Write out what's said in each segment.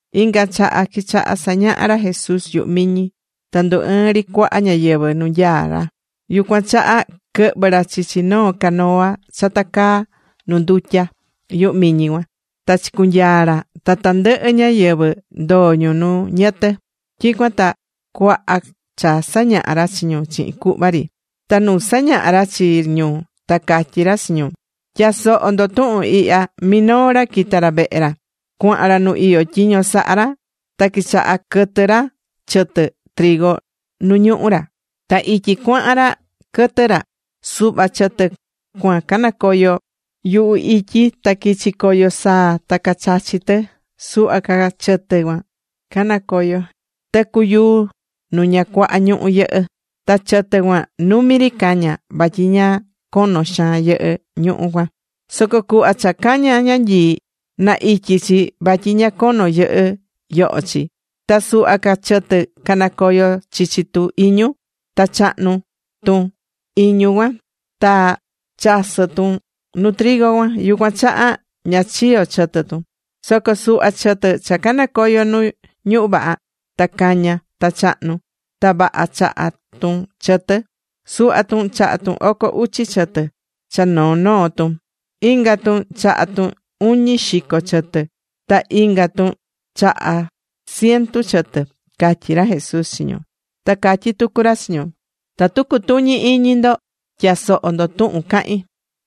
Inga chaha quichaha sañaha ra Jesús yuhu miñi, ta ndu ɨɨ̱n ri cuaha ñáyɨvɨ nu nyaá ra. Yucuan chaha quɨhvɨ̱ ra chichi noo canoa cha tacaá nu ndutya yuhu miñi cuan. Ta chicunyaa̱ ra, ta tandɨhɨ ñáyɨvɨ ndoo ñu nu ñɨtɨ. Tyicuan ta cuaha cha sañaha ra chi ñu chihin cuhva ri. Ta nu sañahá ra chi ñu, ta catyí ra chi ñu: ―Tya̱soho ndo tuhun ihya. Minoo ra quita̱ ra vehe ra, cuahan ra nu iyó tyiño sahá ra. Ta quichaha quɨtɨ ra chɨtɨ nu ñuhú ra. Ta ityi cuahan ra quɨtɨ́ ra, suhva chɨtɨ cuan canacoyo̱ yuhu ityi, ta quichi̱ coyo saa ta cachachi̱ tɨ. Suhva ca chɨtɨ canacoyo̱ tɨcu yuu nu ña cuaha ñuhú yɨhɨ́. Ta chɨtɨ cuan numi ri caña̱, vatyi ña cono xaan yɨhɨ́ ñuhú cuan. Soco cuhva cha caña̱ ñanyii, na ityi chi vatyi ña cono yɨhɨ́ yoho chi. Ta suhva ca chɨtɨ canacoyo̱ chichi tu iñu. Ta chahnu̱ tu iñu cuan, ta chasɨ̱ tun nuu trigo cuan. Yucuan chaha ña chiyo̱ chɨtɨ tun. Soco suhva chɨtɨ cha canacoyo̱ nu ñuhú vaha. Ta caña̱ ta chahnu̱. Ta vaha chaha̱ tun chɨtɨ. Suhva tun chaha̱ tun oco uchi chɨtɨ cha noo noo tun. Inga tun chaha tun uñi xico chɨtɨ. Ta inga tun chaha̱ ciento chɨtɨ ―catyí ra Jesús chi ñu. Ta catyí tucu ra chi ñu: ―Tatu cutuñi iñi ndo, tya̱soho ndo tuhun cahín.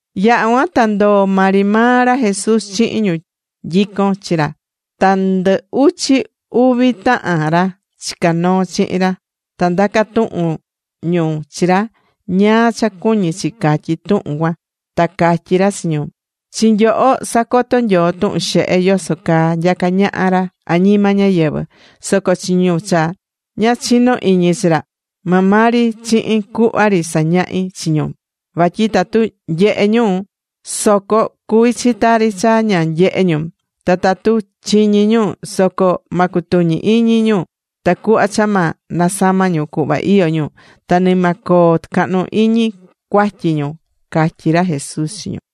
Yaha̱ cuan ta ndoo̱ maa ri maa ra Jesús chihin ñu nyicón chi ra ta ndɨ uchi uvi tahan ra chicá noo chihin ra. Ta candaca̱ tuhun ñu chi ra ñáá cha cuñí chi catyi tuhun cuan. Ta catyí ra chi ñu: ―Chi nyoho sacotó Nyoo tuhun xehe yoso caa nyacá ñaha ra añima ñáyɨvɨ. Soco chi ñu cha ña chinó iñi chi ra, maa maa ri chihin cuhva ri sañahí chi ñu. Vatyi tatu nyehé ñu soco cuví chi tari cha ña nyehé ñu, ta tatu chiñí ñu soco ma cutuñi iñi ñu. Tacuhva cha ma nasama ñu cuhva iyó ñu ta ni ma coo tɨcahnu iñi cuatyi ñu ―catyí ra Jesús chi ñu.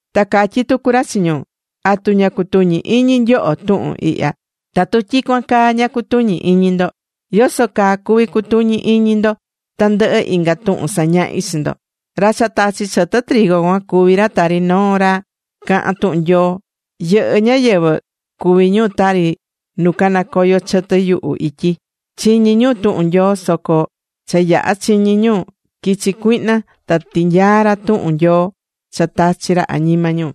Ta catyí tucu ra chi ñu: ―¿Atu ña cutuñí iñi nyoho tuhun ihya? Tatu tyicuan caa ña cutuñí iñi ndo, ¿yoso caa cuví cutuñi ini ndo tandɨhɨ inga tuhun sañahí chi ndo? Ra cha tachí chɨtɨ cuan cuví ra tari noo ra cahán tuhun Nyoo. Yɨhɨ́ ñáyɨvɨ cuví ñu tari nu canacoyo̱ chɨtɨ yuhu ityi: chiñí ñu tuhun Nyoo, soco cha yaha̱ chiñi ñu, quichi cuihna ta tinyaa̱ ra tuhun Nyoo cha tachi̱ ra añima ñu.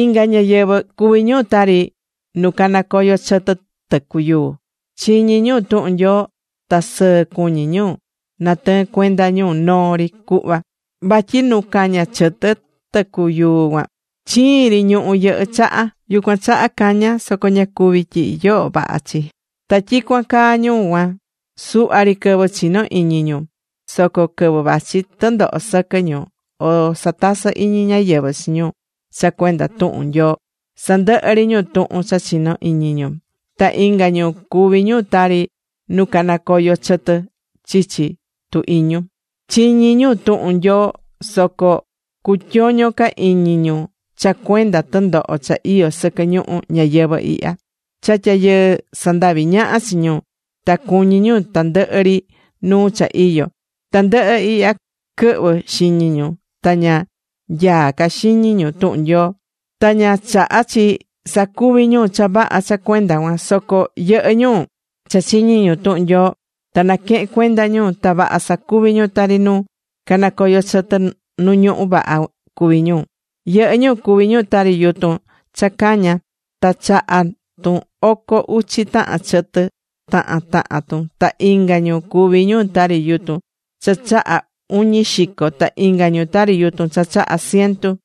Inga ñáyɨvɨ cuví ñu tari nu canacoyo chɨtɨ tɨcu yuu: chiñí ñu tuhun Nyoo ta sɨɨ cuñí ñu natɨɨn cuenda ñu noo ri cuhva. Vatyi nu caña̱ chɨtɨ tɨcu yuu cuan, chiin ri ñuhú yɨhɨ́ chaha, yucuan chaha caña̱ soco ña cuvi̱ tyihi yoho vaha chi. Ta tyicuan caa ñu cuan, suhva ri quɨvɨ chino iñi ñu. Soco quɨvɨ vachi tɨndoho sɨquɨ ñu, o satasɨ iñi ñáyɨvɨ chi ñu cha cuenda tuhun Nyoo, sandɨhɨ ri ñu tuhun cha chinó iñi ñu. Ta inga ñu cuví ñu tari nu canacoyo̱ chɨtɨ chichi tu iñu: chiñí ñu tuhun Nyoo, soco cutyoño ca iñi ñu cha cuenda tɨndoho cha iyó sɨquɨ ñuhu ñayɨvɨ̱ ihya. Cha tyayɨɨ sandaví ñaha chi ñu, ta cuñí ñu tandɨhɨ ri nuu cha iyó. Tandɨhɨ ihya quɨhvɨ́ xiñi ñu ta ña nyaá ca xiñi ñu tuhun Nyoo, ta ña chahá chi sacuvi ñu cha vaha cha cuenda cuan. Soco yɨhɨ́ ñu cha chiñí ñu tuhun Nyoo ta naquehén cuenda ñu, ta vaha sacuví ñu, tari nu canacoyo chɨtɨ nu ñuhú vaha cuví ñu. Yɨhɨ́ ñu cuví ñu tari yutun cha caña̱ ta chaha̱ tun oco uchi tahan chɨtɨ tahan tahan tun. Ta inga ñu cuví ñu tari yutun cha chaha̱ uñi xico. Ta inga ñu tari yutun cha chaha̱ ciento.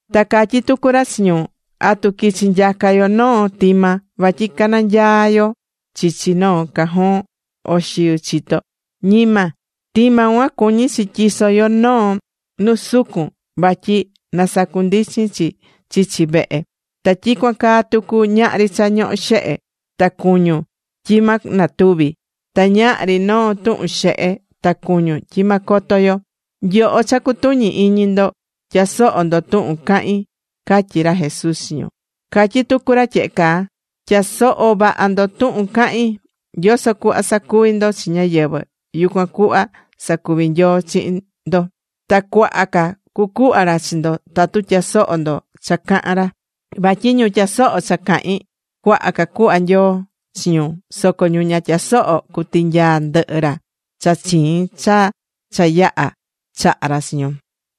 Ta catyí tucu ra chi ñu: ―¿Atu quichi nyaca yo noo tima vatyi cananyaa yo chichi noo cajón o xiu chito? Ñima. Tima cuan cuñí chi tyiso yo noo nu sucun vatyi na sacundichin chi chichi vehe. Ta tyicuan caa tucu, ñahri cha ñohó xehe, ta cuñun, tyi ma natuvi. Ta ñahri noo tuhun xehe, ta cuñun, tyi ma coto yo. Nyoho cha cutuñí iñi ndo, tya̱soho ndo tuhun cahín ―catyí ra Jesús chi ñu. Catyí tucu ra tyehe caa: ―Tya̱soho vaha ndo tuhun cahín. Yoso cuhva sacuví ndo chi ñáyɨvɨ, yucuan cuhva sacuvi Nyoo chihin ndo. Ta cuaha ca cucuhva ra chi ndo tatu tyasohó ndo cha cahán ra. Vatyi ñu tyasohó cha cahín, cuaha ca cuhva Nyoo chi ñu. Soco ñu ña tyasohó, cutinyaa ndɨhɨ ra cha chiin cha cha yaha̱ chaha̱ ra chi ñu.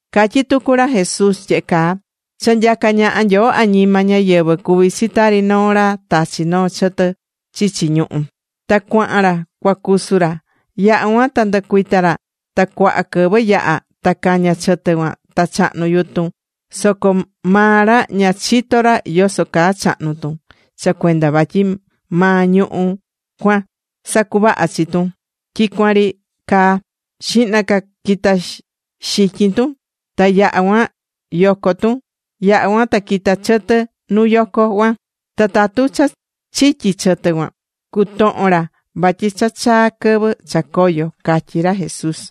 Catyí tucu ra Jesús tyehe caa: ―Cha nyacá ñaha Nyoo añima ñáyɨvɨ cuví chi tari noo ra tachi̱ noo chɨtɨ chichi ñuhú. Ta cuahan ra cua cusu ra. Yaha̱ cuan ta ndɨcuita ra. Ta cuaha quɨvɨ yaha. Ta caña chɨtɨ cuan, ta chahnu̱ yutun. Soco maa ra ña chitó ra yoso caa chahnu̱ tun. Cha cuenda vatyi maa ñuhú cuan sacuvahá chi tun tyicuan ri caa. Xihna ca quita̱ xityin tun, ta yaha cuan yoco tun, yaha cuan ta quita̱ chɨtɨ nu yoco cuan. Ta tatu cha chityi chɨtɨ cuan, cutohon ra vatyi cha chaa̱ quɨvɨ cha coyo ―catyí ra Jesús.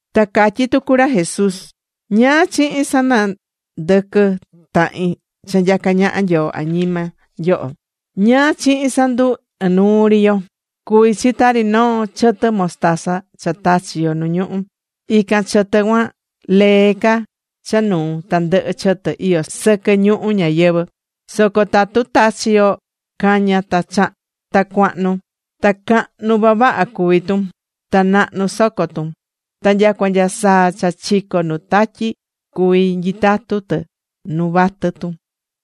Ta catyí tucu ra Jesús: ―¿Ñáá chihin sanandɨquɨ tahin cha nyacá ñaha Nyoo añima yo? ¿Ñáá chihin sandu ɨnuu ri yo? Cuví chi tari noo chɨtɨ mostaza cha tachi̱ yo nu ñuhú. Ican chɨtɨ cuan, lee ca cha nuu tandɨhɨ chɨtɨ iyó sɨquɨ ñuhu ñayɨvɨ̱. Soco tatu tachí yo, cañá ta cuahnu. Ta cahnu vavaha cuví tun. Ta nahnu soco tun, ta nyacua nya saa cha chicó nu tatyi cuví nyitatu tɨ nu vatɨ tun.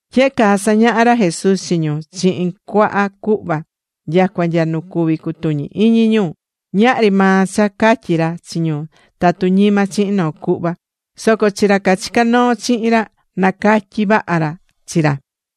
Tyehe caa sañaha̱ ra Jesús chi ñu, chihin cuaha cuhva, nyacua nya nu cuví cutuñi íñi ñu. Ñahri maa cha catyí ra chi ñu tatu ñima chihin noo cuhva. Soco chi ra cachicá noo chihin ra, nacatyí vaha ra chi ra.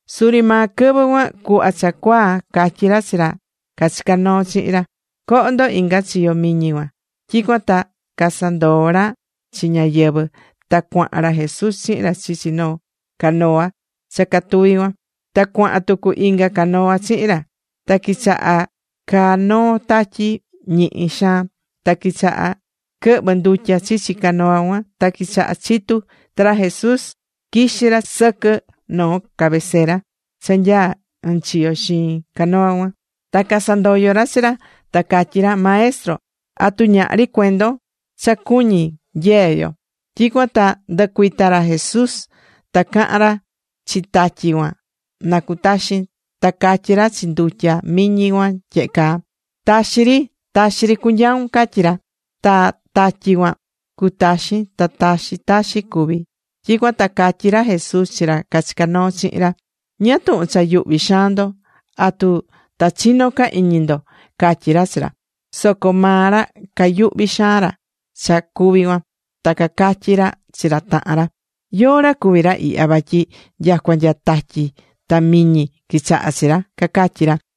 Suri maa quɨvɨ cuan, cuhva cha cuaa̱, catyi ra chi ra cachicá noo chihin ra: ―Co̱ho ndo inga chiyo miñi cuan. Tyicuan ta casandoo̱ ra chi ñáyɨvɨ. Ta cuahan ra Jesús chihin ra chichi canoa cha catuvi cuan. Ta cuahan tucu inga canoa chihin ra. Ta quichaha caa noo tatyi ñihi xaan, ta quichaha quɨhvɨ ndutya chichi canoa cuan, ta quichaha chitu. Ta ra Jesús quixí ra sɨquɨ noo cabecera cha nyaá ɨnchiyo xiin canoa cuan. Ta casandoyo̱ ra chi ra, ta cacatyí ra: ―¡Maestro! ¿atu ñahri cuendon cha cuñí nyee yo? Tyicuan ta ndɨcuita̱ ra Jesús ta cahan ra chi tatyi cuan na cutaxin. Ta catyí ra chi ndutya miñi cuan tyehe caa: ―¡Taxi ri! ¡Taxi cu̱nyaun! ―catyí ra. Ta tatyi cuan cutaxin, ta taxi taxi cuví. Tyicuan ta catyí ra Jesús chi ra cachicá noo chihin ra: ―¿Ñáá tuhun cha yuhví xaan ndo? ¿Atu ta chino ca iñi ndo? ―catyí ra chi ra. Soco maa ra cayuhví xaan ra cha cuvi̱ cuan. Ta cacatyi̱ ra chi ra tahan ra: ―¿Yóó ra cuví ra ihya, vatyi nyacua nya tatyi ta miñi quichahá chi ra? ―cacatyí ra.